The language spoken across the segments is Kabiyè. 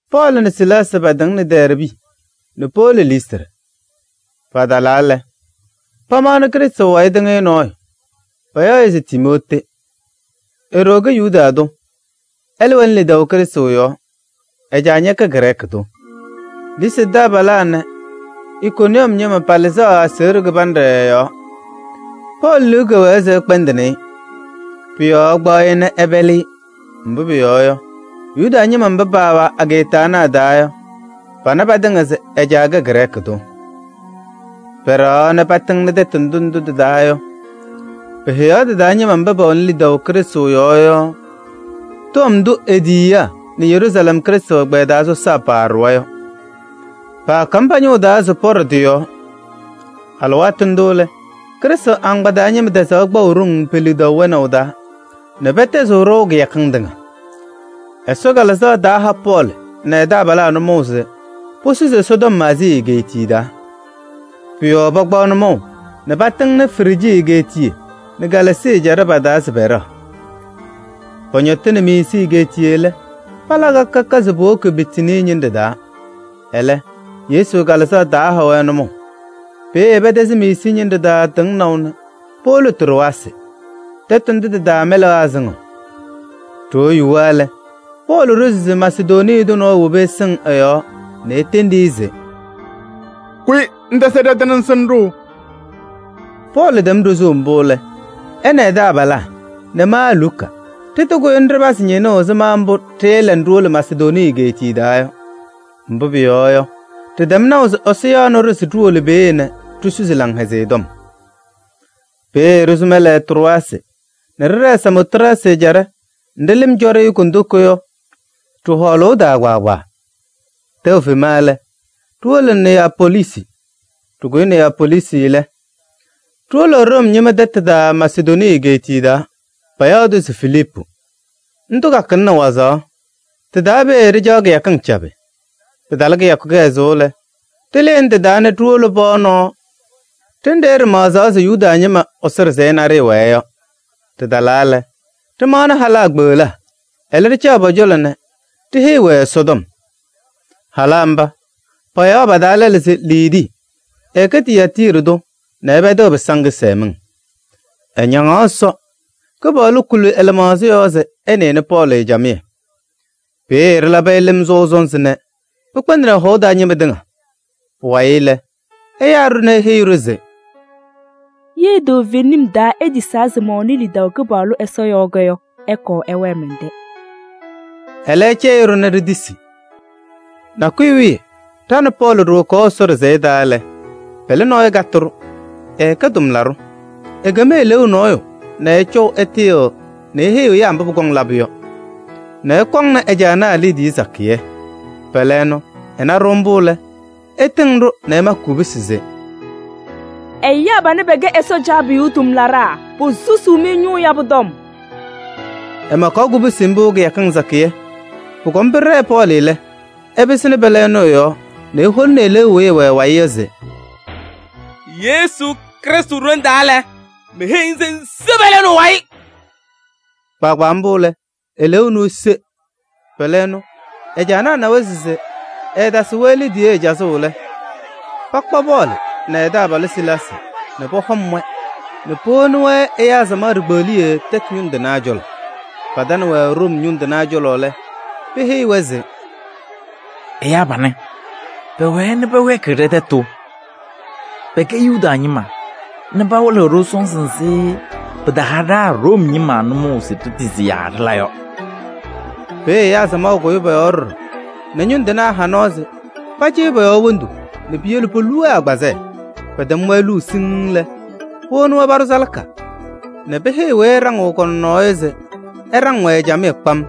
Pɔɔlɩ nɛ Silaasɩ paatɩŋnɩ Dɛɛrbɩ nɛ powolo Listrɩ. Patalaa lɛ, pamaɣnɩ Krɩstʋ wayɩ tɩŋɩyʋ nɔɔyʋ, payaɣ-ɩ se Timootee. E-ɖoo kɛ Yuda tʋ, ɛlɛ wɛnɩ lidaʋ Krɩstʋ yɔɔ. Ɛ-caa ñɛkɛ Grɛɛkɩ tʋ. Listrɩ taabalaa nɛ Ikoniyɔm ñɩma palɩzaɣ aseɣɖe kɩbanɖɛ ɛ-yɔɔ. Pɔɔlɩ liu kɛwɛɛ se ɛkpɛndɩnɩ-ɩ. Pʋ-yɔɔ ɛkpaɣ-ɩ nɛ ɛpɛlɩ-ɩ, mbʋ pʋyɔɔ yɔ, Yuda ñɩma mba paawɛ ageeta ana a-taa yɔ, pana patɩŋa se ɛ-caa kɛ Grɛɛkɩ tʋ. Pɛɖɛɣaɣ nɛ patɩŋnɩ tɛtʋ ndʋ ndʋ tɩ-taa yɔ, peheyaɣ tɩ-taa ñɩma mba pɛwɛnɩ lidaʋ Krɩstʋ yɔɔ yɔ tɔm ndʋ e-tiyiyaa nɛ Yeruusalɛm Krɩstʋ ɛgbɛyɛ taa sɔsaa paaɖʋwa yɔ. Paakam pa-ñʋŋ taa se pɔɖɔ tɩ-yɔɔ. Alɩwaatʋ ndʋ lɛ, Krɩstʋ agbaa taa ñɩma tɛzaɣ kpaʋ ɖoŋ pe-lidaʋ wɛnaʋ taa nɛ pɛtɛzɩɣ ɖɔʋ kɩyakɩŋ tɩŋa. Ɛsɔ Kalɩzaɣ taaha Pɔɔlɩ nɛ ɛ-taabalaa nʋmɔʋ se posusi Ɛsɔtɔm Aazii egeetiye taa. Pʋ-yɔɔ pakpaɣ nʋmɔʋ nɛ patɩŋnɩ Frijii egeetiye nɛ Galaasii ɛjaɖɛ pa-taa se pɛɖɛɣ. Pɔñɔtɩnɩ Miisii egeetiye lɛ, pala ka ka se powoki Bitinii ñɩnɖɛ taa, ɛlɛ, Yesu Kalɩzaɣ taha-wɛ nʋmɔʋ. Peeye pɛtɛzɩ Miisii ñɩnɖɛ taa tɩŋnaʋ nɛ powolo Trowaasɩ. Tɛtʋ ndʋ tɩ-taa mɛlɛnaa sɩŋɩɣ. Ɖoo yuwa lɛ, Pɔɔlɩ ɖozi se Masedonii tʋ nɔɔyʋ wobi ɛsɩŋ ɛ-yɔɔ nɛ etendi-i se: “Kʋyɩ ŋtɛzɩ ɖɛ-tɛ nɛ ŋsɩnɩ-ɖʋ.” Pɔɔlɩ tɛm ɖozuu mbʋ lɛ, ɛ nɛ ɛ-taabalaa nɛ ma Luka ɖɩtɩkʋyɩ nɛ ɖɩpazɩ ñɩnʋʋ ɛzɩma mbʋ ɖɩɩla nɛ ɖiwolo Masedonii egeetiye taa yɔ. Mbʋ pʋyɔɔ yɔ, ɖɩtɛm naʋ se Ɛsɔ yaɣnɩ-ɖʋ se ɖiwolo peeye nɛ ɖisusi Laŋhɛzɩyɛ Tɔm. Peeye ɖɩsʋ mɛlɛ Trowaasɩ nɛ ɖɩɖɛɛ Samootrasɩ ɛjaɖɛ nɖɩ lɩm cɔ-ɖɩ kondiko yɔ ɖɩ-hɔɔlʋʋ taa kpaagbaa. Tɛʋ fema lɛ, ɖiwolo Neyapoliisi. Ɖɩkʋyɩ Neyapoliisi lɛ, ɖiwolo Room ñɩma tɛtʋ taa Masedonii egeetiye taa, payaɣ-tʋ se Filiipu. Ndʋ kakɩlɩnɩ wazaɣ. Tɩ-taa peeye ɖɩcaɣ kɩyakɩŋ cabɩ. Pɩtalɩ kɩyakʋ kɩhɛzʋʋ lɛ, ɖɩlɩnɩ tɩ-taa nɛ ɖiwolo pɔɔ nɔɔ ɖenɖe ɖɩmaɣzaɣ se Yuda ñɩma Ɛsɔ ɖɩsɛyɛ naɖɩyɛ wɛɛ yɔ. Ɖɩtalaa lɛ, ɖɩmaɣnɩ halaa kpeɣlaa, ɛlɛ ɖɩcaɣ pɔ-cɔlɔ nɛ ɖiheyiɣ-wɛ Ɛsɔtɔm. Halaa mba, payaɣ pa-taa lɛlʋ se Liidii, ɛkɛ Tiyaatiiri tʋ nɛ ɛpɛdɩɣ pɩsaŋ kɩsɛmɩŋ. Ɛñaŋaɣ Ɛsɔ, Kɩpaɣlʋ kuli ɛ-lɩmaɣza yɔɔ se ɛnɩnɩ Pɔɔlɩ camɩyɛ. Peeye ɖɩlabɩ-ɩ lɩm sɔʋ sɔnzɩ nɛ pɩkpɛndɩnɩ ɛ-hɔʋ taa ñɩma tɩŋa. Pʋwayɩ lɛ, ɛyaa-ɖʋ nɛ eheyi-ɖʋ se: “Ye toovenim taa itisaa se mɛwɛnɩ lidaʋ Kɩpaɣlʋ Ɛsɔ yɔɔ yɔ, ɩkɔɔ ɩwɛɛ mɛn-tɛ.” Ɛlɛ ɛcɛyɩ-ɖʋ nɛ ɖitisi. Nakʋyʋ wiye ɖa nɛ Pɔɔlɩ ɖiwokaɣ Ɛsɔ ɖɩsɛyɛ taa lɛ, pɛlɛ nɔɔyʋ katɩ-ɖʋ, ɛkɛ tʋmlaɖʋ. Ekem eleeu nɔɔyʋ nɛ ɛcɔʋ ɛtɩyɩɣ nɛ eheyiɣ ɛyaa mbʋ pʋkɔŋ labʋ yɔ nɛ ɛkɔŋnɩ ɛ-caanaa liidiye sakɩyɛ. Pɛlɛ ɛnʋ, ɛna-ɖʋ mbʋ lɛ, ɛtɩŋɩɣ-ɖʋ nɛ ɛmakɩ kubusi se: “Ɛyaa panɛ pɛkɛ Ɛsɔ Caabiyuu tʋmlaɖaa, posusuu-mɩ ñʋʋ yabʋ tɔm.” Ɛmakaɣ kubusi mbʋ kɩyakɩŋ sakɩyɛ. Pʋkɔm pɩɖɛɛ Pɔɔlɩ lɛ, ɛpɩsɩnɩ pɛlɛ ɛnʋ ɛ-yɔɔ nɛ eholini eleeu weyi ɛwɛ ɛ-wayɩ yɔ se: “Yesu Krɩstʋ ɖoŋ taa lɛ, meheyiɣ-ŋ se ŋse pɛlɛ ɛnʋ ɛ-wayɩ!” Kpaagbaa mbʋ lɛ, eleeu ɛnʋ ese. Pɛlɛ ɛnʋ ɛ-caanaa nawa se ɛɛtasɩɣ-wɛ liidiye cazʋʋ lɛ, pakpa Pɔɔlɩ nɛ ɛ-taabalʋ Silaasɩ nɛ pɔhɔm-wɛ nɛ powoni ɛyaa samaɣ ɖikpeɣliye tɛtʋ ñʋŋ tɩnaa cɔlɔ. Patanɩ-wɛ Room ñʋŋ tɩnaa cɔlɔ lɛ, peheyi-wɛ se: “Ɛyaa panɛ, pɛwɛɛ nɛ pɛwɛɛkɩɣ ɖɛ-tɛtʋ. Pɛkɛ Yuda ñɩma nɛ pawɩlɩɣ-ɖʋ sɔnzɩ nzɩ pɩtaha ɖa Room ñɩma nʋmɔʋ se ɖitisi yaa ɖɩla yɔ.” Peeye ɛyaa samaɣ kʋyɩ pɔ-yɔɔ ɖɔɖɔ nɛ ñʋŋ tɩnaa ha nɔɔ se pacɩyɩ pɔ-yɔɔ wondu nɛ piyele polu-wɛ agbazɛɛ. Pɛtɛm-wɛ luu siŋŋ lɛ, powoni-wɛ paɖʋ salaka nɛ peheyi weyi ɛɖaŋɩɣ kɔ-nɔnɔɔ yɔ se ɛɖaŋ-wɛ camɩyɛ kpam.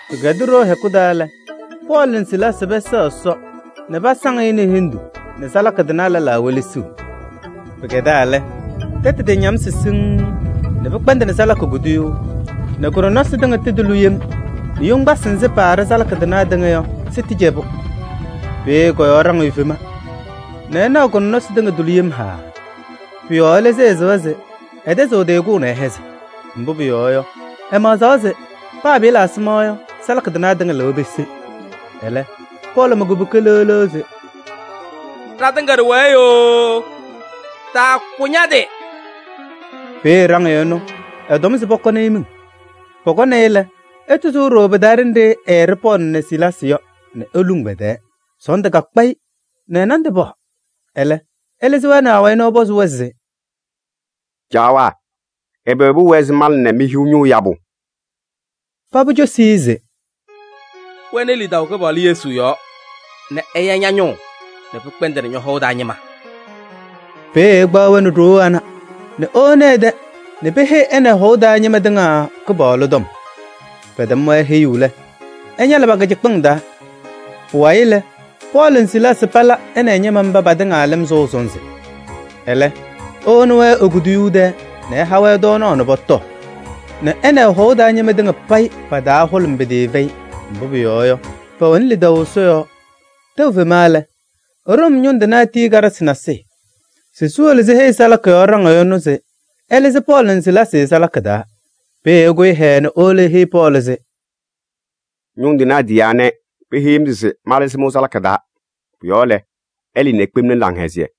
Pɩkɛdɩ ɖoo hɛkʋ taa lɛ, Pɔɔlɩ nɛ Silaasɩ pɛsɛɣ Ɛsɔ nɛ pasaŋ-ɩ nɛ hendu nɛ salaka tɩnaa lɛlaa welesiɣ. Pɩkɛdaa lɛ, tɛtʋ tɩñamsɩ siŋŋ nɛ pɩkpɛndɩnɩ salaka kuduyuu nɛ kʋ-nɔnɔsɩ tɩŋa tɩtʋlɩ yem nɛ yoŋgbasɩ nzɩ paaɖɩ salaka tɩnaa tɩŋa yɔ sɩtɩcɛbʋ. Peeye kɔ-yɔɔ ɖaŋɩyʋ fema nɛ ɛnaɣ kɔ-nɔnɔsɩ tɩŋa tʋlɩ yem haaa. Pʋ-yɔɔ ɛlɩzɩ ɛ-sɩɣa se ɛtɛzɩɣ ɛ-tɩ kʋʋ nɛ ɛhɛzɩ. Mbʋ pʋyɔɔ yɔ, ɛmaɣzaɣ se paa pɩɩla ɛzɩma yɔ, salaka tɩnaa tɩŋa lɩwa pese. Ɛlɛ, Pɔɔlɩ ma kubuka leɣ leɣ se: “Ɖatɩŋa ɖɩwɛɛ yooo, taakʋ ña-tɩ!” Peeye ɖaŋɩyʋ ɛnʋ ɛtɔm se pɔkɔnɩ-ɩ miŋ. Pɔkɔnɩ-ɩ lɛ, ɛtɩsʋʋ ɖooo pɩ-taa ɖenɖe ɛɖɩɣ Pɔɔlɩ nɛ Silaasɩ yɔ nɛ eluŋ pɛ-tɛɛ. Sɔɔndʋ kakpa-ɩ nɛ ɛ-nandʋ paɣ. Ɛlɛ ɛlɩzɩ-wɛ nɛ awayɩ nɛ ɛpɔzɩ-wɛ se: “Caawaa! Ɛbɛ pʋwɛɛ se mala nɛ mehiɣ ñʋʋ yabʋ?” Paba cosi-i se: “Wɛnɩ lidaʋ Kɩpaɣlʋ Yesu yɔɔ nɛ ɛya ña-ñʋʋ nɛ pɩkpɛndɩnɩ ñɔ-hɔʋ taa ñɩma.” Peeye ɛkpaɣ-wɛ nɛ ɖoo ana nɛ ewoni ɛ-tɛ nɛ peheyi ɛ nɛ ɛ-hɔʋ taa ñɩma tɩŋa Kɩpaɣlʋ tɔm. Pɛtɛm-wɛ heyuu lɛ, ɛñalɩ pa-kɩcɩkpɩŋ taa. Pʋwayɩ lɛ, Pɔɔlɩ nɛ Silaasɩ pala ɛ nɛ ɛ-ñɩma mba patɩŋa lɩm sɔʋ sɔnzɩ. Ɛlɛ ewoni-wɛ e-kuduyuu tɛɛ nɛ ɛha-wɛ tɔɔnaɣ nɛ pɔtɔɔ nɛ ɛ nɛ ɛ-hɔʋ taa ñɩma tɩŋa payɩ pa-taa hʋlʋmɩ pɩtɩɩfɛyɩ, mbʋ pʋyɔɔ yɔ, pɛwɛnɩ lidaʋ Ɛsɔ yɔɔ. Tɛʋ fema lɛ, Room ñʋŋ tɩnaa tiyi karɩsɩ nasɩyɩ se siwolo siheyi salaka yɔɔ ɖaŋɩyʋ ɛnʋ se ɛlɩzɩ Pɔɔlɩ nɛ Silaasɩ salaka taa. Peeye ɛkʋyɩ hɛɛɛ nɛ ewolo eheyi Pɔɔlɩ se: “Ñʋŋ tɩnaa tiyaa nɛ peheyi-m se malɩzɩ-mɩ salaka taa. Pʋ-yɔɔ lɛ, ɩlɩɩ ikpemni laŋhɛzɩyɛ.”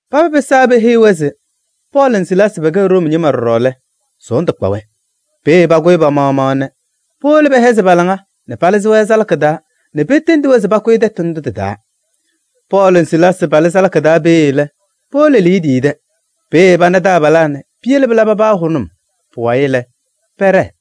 Paba pɩsaa peheyi-wɛ se Pɔɔlɩ nɛ Silaasɩ pɛkɛ Room ñɩma ɖɔɖɔ lɛ, sɔɔndʋ kpa-wɛ. Peeye pakʋyɩ pa-maɣmaɣ nɛ powolo pɛhɛzɩ pa-laŋa nɛ palɩzɩ-wɛ salaka taa nɛ petendi-wɛ se pakʋyɩ tɛtʋ ndʋ tɩ-taa. Pɔɔlɩ nɛ Silaasɩ palɩ salaka taa peeye lɛ, powolo Liidii tɛ. Peeye pana taabalaa nɛ peyele pɩla paba hʋnʋm. Pʋwayɩ lɛ, pɛɖɛɛ.